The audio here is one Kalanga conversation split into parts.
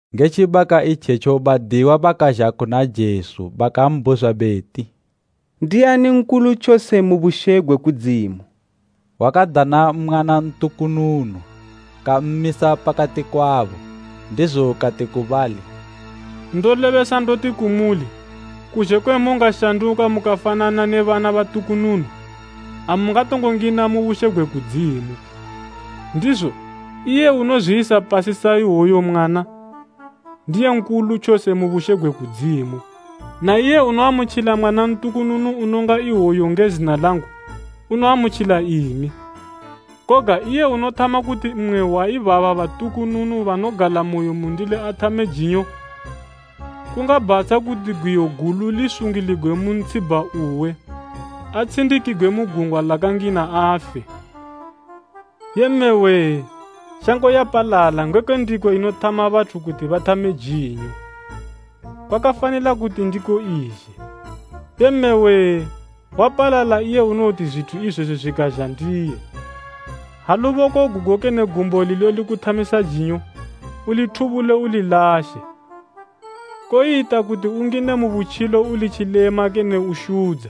Nge tjibaka itjetjo badiyiwa bakazha kuna Jesu bakambhuzwa beti, “Ndiani nkulu tjose mu bushe gwe kudzimu?” Wakadana mwana ntukununu kammisa pakati kwabo, ndizo kati ku bali, “Ndolebesa ndoti kumuli, kuzhe kwe mungashanduka mukafanana ne bana batukununu, amungatongo ngina mu bushe gwe kudzimu. Ndizo, iye unozwiyisa pasi sa iwoyu mwana, ndiye nkulu tjose mu bushe gwe kudzimu. Na iye unoamutjila mwana ntukununu unonga iwoyu nge zina langu, unoamutjila imi. “Koga iye unothama kuti mmwe wa ibaba batukununu banogalamoyo mundili athame jinyo, kungabhatsha kuti gwiyo gulu lisungiligwe mu ntshibha uwe atshindikigwe mu gungwa lakangina afe. Yee mme wee! Shango yapalala ngekwe ndiko inothama bathu kuti bathame jinyo! Kwakafanila kuti ndiko izhe, Yee mme wee wapalala! Iye unowoti zwithu izwezo zwikazha ndiye! “Ha luboko gugo kene gumbo lilo likuthamisa jinyo, ulithubule ulilashe. Koyita kuti ungine mu butjilo uli tjilema kene ushudza,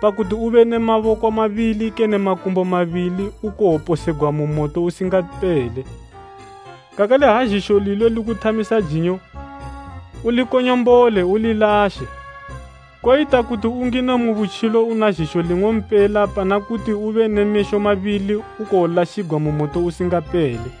pakuti ube ne maboko mabili kene makumbo mabili ukowoposegwa mu moto usingapele. Kakale ha zhisho lilo likuthamisa jinyo, ulikonyombole ulilashe. Koyita kuti ungine mu butjilo una zhisho ling'ompela pana kuti ube ne mesho mabili ukowolashigwa mu moto usingapele.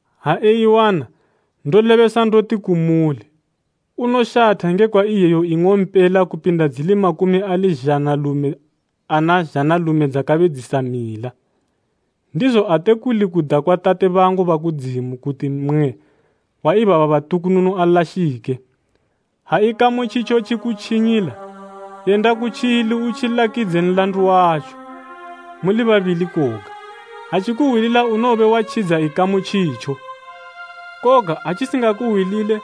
Ha eiwana, ndolebesa ndoti kumuli, unoshatha ngekwa iyeyo ing'ompela kupinda dzili makumi ali zhanalume ana zhanalume dzakabe dzisamila. Ndizo ate kuli kuda kwa Tate bangu ba kudzimu kuti mmwe wa ibaba batukununu alashike. “Ha ikamu tjitjo tjikutjinyila, yenda kutjili utjilakidze nlandu watjo, muli babili koga. Ha tjikuhwilila unowobe watjidza ikamu tjitjo. Koga atjisingakuhwilile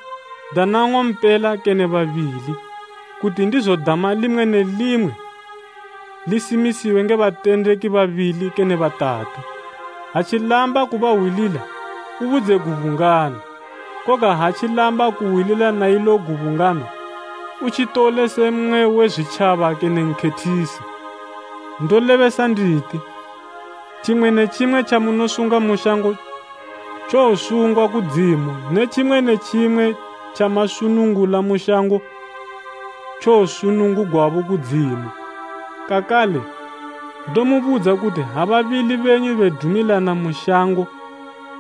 dana nng'ompela kene babili, kuti ndizo dama limwe ne limwe lisimisiwe nge batendeki babili kene batatu. Ha tjilamba kubahwilila, ubudze gubungano, koga ha tjilamba kuhwilila na ilo gubungano, utjitole se mmwe we zwitjaba kene nkhethisi. “Ndolebesa nditi, tjimwe ne tjimwe tjamunosunga mu shango tjowosungwa kudzimu ne tjimwe ne tjimwe tjamasunungula mu shango tjowosunungugwabo kudzimu. “Kakale, ndomubudza kuti ha babili benyu bedumilana mu shango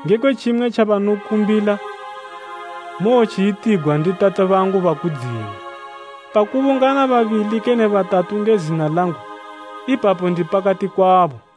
ngekwe tjimwe tjabanokumbila, mowotjiyitigwa ndi Tate bangu ba kudzimu. Pakubungana babili kene batatu nge zina langu, ipapo ndi pakati kwabo.”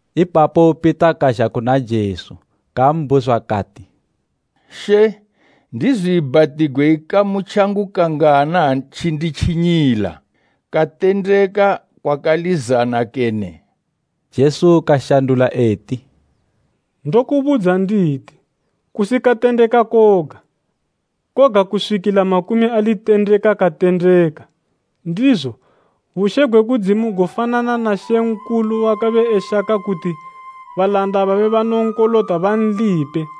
Ipapo Pita kazha kuna Jesu kambhuzwa kati, “She, ndizwiibhatigwe ikamu tjangu kangana ha tjinditjinyila? Katendeka kwakalizana kene?” Jesu kashandula eti, “Ndokubudza nditi, kusi katendeka koga, koga kuswikila makumi ali tendeka katendeka. Ndizo, bushe gwe kudzimu gofanana na mambo wakabe eshaka kuti balanda babe banonkolota banlipe.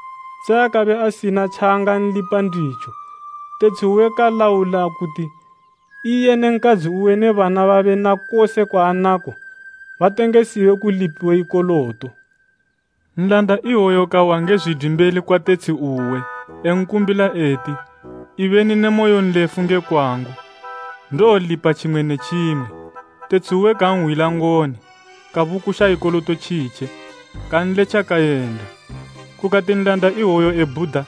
Se akabe asina tjaangalipa nditjo, tetshi uwe kalaula kuti iye ne nkadzi uwe ne bana babe na kose kwaanako, batengesiwe kulipiwe ikoloto. Nlanda iwoyo kawa nge zwidwi mbeli kwa tetshi uwe, enkumbila eti, ‘Ibeni ne moyonlefu nge kwangu. Ndowolipa tjimwe ne tjimwe.’ Tetshi uwe kanhwila ngoni, kabukusha ikoloto tjitje, kanletja kayenda. “Kukati nlanda iwoyo ebhuda,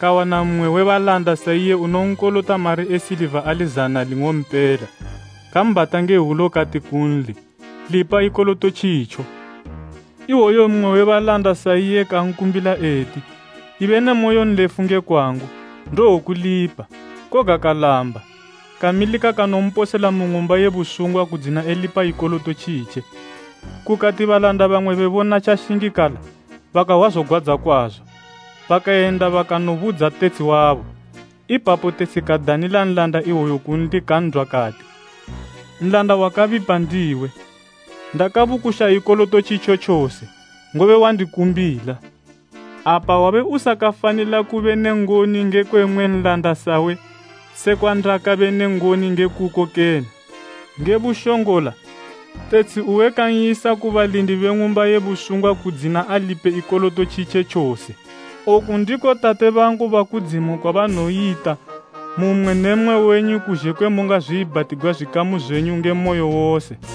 kawana mmwe we balanda sa iye unonkolota mari e siliva ali zana ling'ompela. Kambhata nge hwulo kati kunli, ‘Lipa ikoloto tjitjo.’ Iwoyu mmwe we balanda sa iye kankumbila eti, ‘Ibe ne moyonlefu nge kwangu, ndowokulipa.’ Koga kalamba, kamilika kanomposela mu ng'umba ye busungwa kudzina elipa ikoloto tjitje. Kukati balanda bamwe bebona tjashingikala, bakahwa zogwadza kwazo, bakayenda bakanobudza tetshi wabo. Ipapo tetshi kadanila nlanda iwoyo kunli kan'dwa kati, ‘Nlanda wakabipa ndiwe! Ndakabukusha ikoloto tjitjo tjose, ngobe wandikumbila. Apa wabe usakafanila kube ne ngoni ngekwe mmwe nlanda sawe sekwa ndabe ne ngoni nge kuko kene?’ Nge bushongola, tetshi uwe kan'yisa ku balindi be ng'umba ye busungwa kudzina alipe ikoloto tjitje tjose. “Oku ndiko Tate bangu ba kudzimu kwabanowoyita mu mmwe ne mmwe wenyu kuzhe kwe mungazwiibhatigwa zwikamu zwenyu nge moyo wose.”